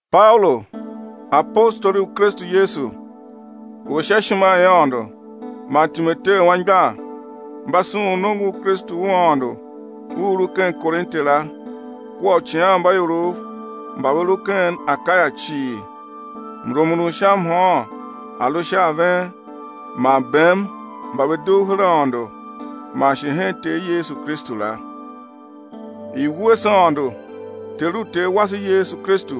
Paulu, apostoli u Kristu Yesu u sha ishima i Aôndo man Timoteu anmgbian, mba sughun nongo u Kristu u Aôndo u u lu ken Korinte la kua uicighanmbaiorov mba ve lu ken Akaya cii. Mrumun u sha mhôôn a̱ lu sha a ven man bem mba ve dugh her Aôndo man shi hen Ter Yesu Kristu la. I̱ wuese Aôndo Ter u Ter wase Yesu Kristu,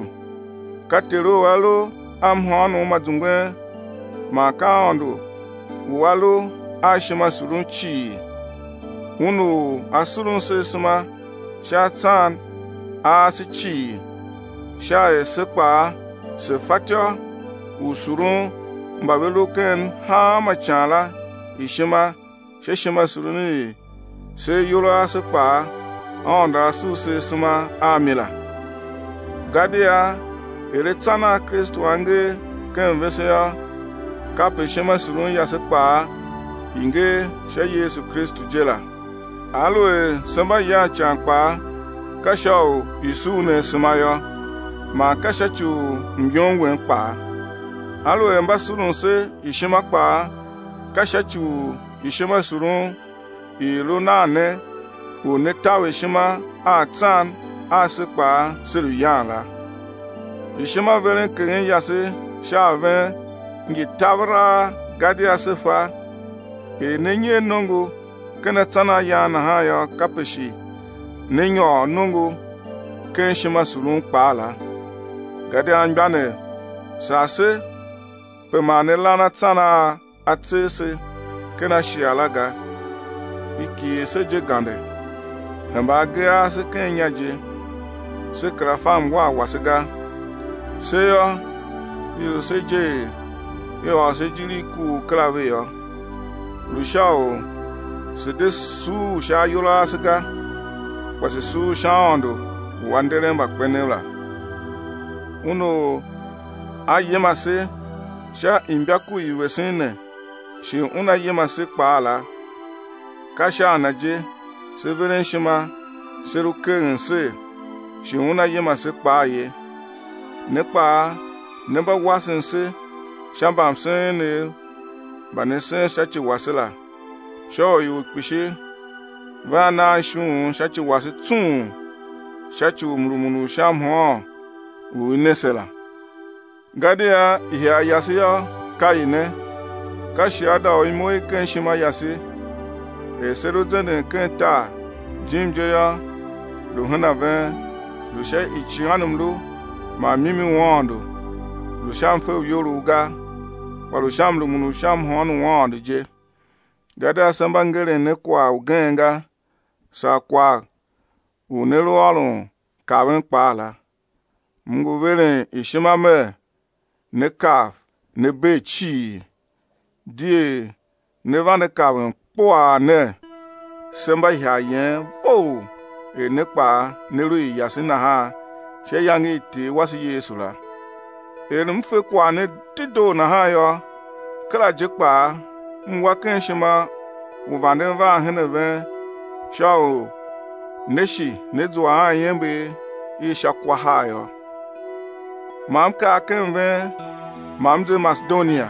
ka Ter u A lu a mhôônom ma zungwen man ka Aôndo u A lu a ishimasurun cii, Un u A surun se asema sha atsan a ase cii sha er se kpaa se fatyô u surun mba ve lu ken hanma ican la ishima sha ishimasurun i se ayol a ase kpaa Aôndo A sur se asema a mi la. Gadia er atsan a Kristu a ngee ken vese yô, kape ishimasurun yase kpaa i ngee sha Yesu Kristu je la. Aluer se mba yan ican kpaa, ka sha u i̱ sur ne asema yô, man ka sha ci u myom wen kpaa. Aluer mba surun se ishima kpaa, ka sha ci u ishimasurun i i lu nan ne u ne̱ taver ishima a atsan a se kpaa se lu yan la. Ishimaverenkeghen yase sha a ven ngi taveraa gadia se fa, er ne nyer nongo ken atsan a yan nahan yô, kape shi né nyôr nongo ken ishimasurun kpaa la. Gadia anmgbianev, sar se pe ma ne lan atsan a a tser se ken Ashia la ga, i kighir se je gande, hemba agee ase ken inya je, se kera fa mwar wase ga. Se yô, i lu se je er i ôr se ijir i kuugh kera ve yô, lu sha u se̱ de suur sha ayol a ase ga, kpa se̱ suur sha Aôndo u A nderen mbakpenev la. Un u A yima se sha imbaku i vesen ne shi Una yima se kpaa la, ka sha a Na je se veren ishima se lu keghen ser, shi Una yima se kpaa ye. Ne kpaa ne mba wasen se sha mbamsen enev mba ne sen sha ci wase la, sha u ior kpishi vea naan ishughun sha ci wase tsung sha ci u mrumun u sha mhôôn u i ne se la. Gadia ihagh yase yô, ka i ne, ka shiada u imo i ken ishima yase, er se lu zenden ken tar, jim je yô lu hen a ven, lu sha icighanmlu man mimi u Aôndo lu sha mfe u iyolough ga, kpa lu sha mrumun u sha mhôôn u Aôndo je. Gadia se mba ngeren ne kwagh ugen ga, saa kwagh u ne lu ôron kaven kpaa la. M ngu veren ishima mer né kav, né bee cii, di er ne vande kaven kpuaa ner: se mba ihagh yen vough er ne kpaa ne lu i yase nahan sha iyange i Ter wase Yesu la. Er m fe kwagh ne dedoo nahan yô, kera je kpaa m wa ken ishima u vanden van hen ven sha u né shi né zua a iember i sha kwa har yô. Ma m kar ken ven ma m ze Masedonia,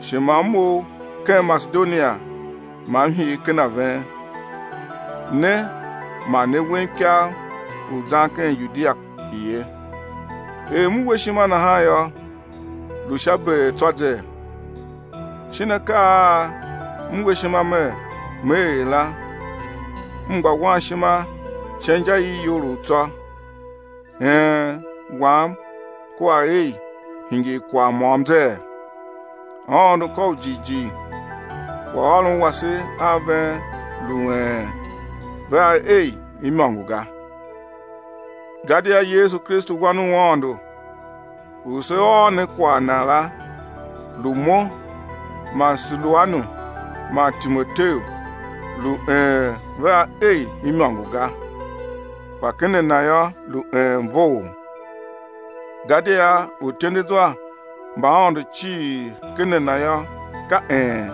shi ma m mough ken Masedonia ma m hir ken a ven, ne ma ne wem ikav u zan ken Yudia ye. Er m we ishima nahan yô, lu sha beer tsô zee? Shin akaa a m we ishima mer me er la, m gba wan ishima sha inja i iyolough tsô, “een” wam kua “ei” hingir kwagh môm zee? Aôndo ka u jighjigh, kwaghôron wase a ven lu “een” vea “ei” imôngo ga. Gadia Yesu Kristu Wan u Aôndo u se ôr ne kwagh Na la lu mo man Siluanu man Timoteu, lu “een” vea “ei” imôngo ga, kpa ken a Na yô, lu “een” vough. Gadia uityendezwa mba Aôndo cii, ken A Na yô, ka “een”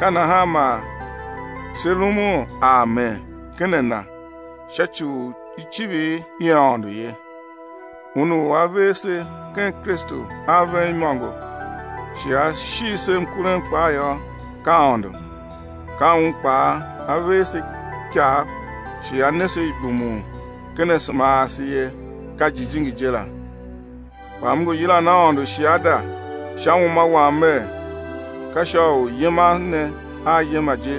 ka nahan man se rumun amen ken a Na sha ci u icivir i Aôndo ye. Un u A ver se ken Kristu a ven imôngo shi A shigh se mkurem kpaa yô, ka Aôndo. Ka Un kpaa A ver se ikav shi A ne se ibumun ken asema ase ye, ka Jijingi je la. Kpa m ngu yilan Aôndo shiada sha uma wam mer, ka sha u yiman ne a yima je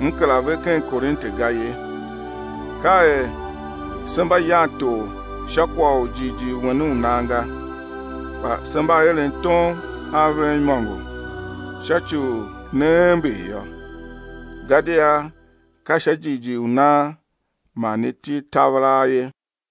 m kera ve ken Korinte ga ye. Ka er se mba yan tor sha kwagh u jighjigh wen u nan ga, kpa se mba eren tom a ven imôngo sha ci u né ember yô, gadia ka sha jighjigh u nan man ne til taveraa ye.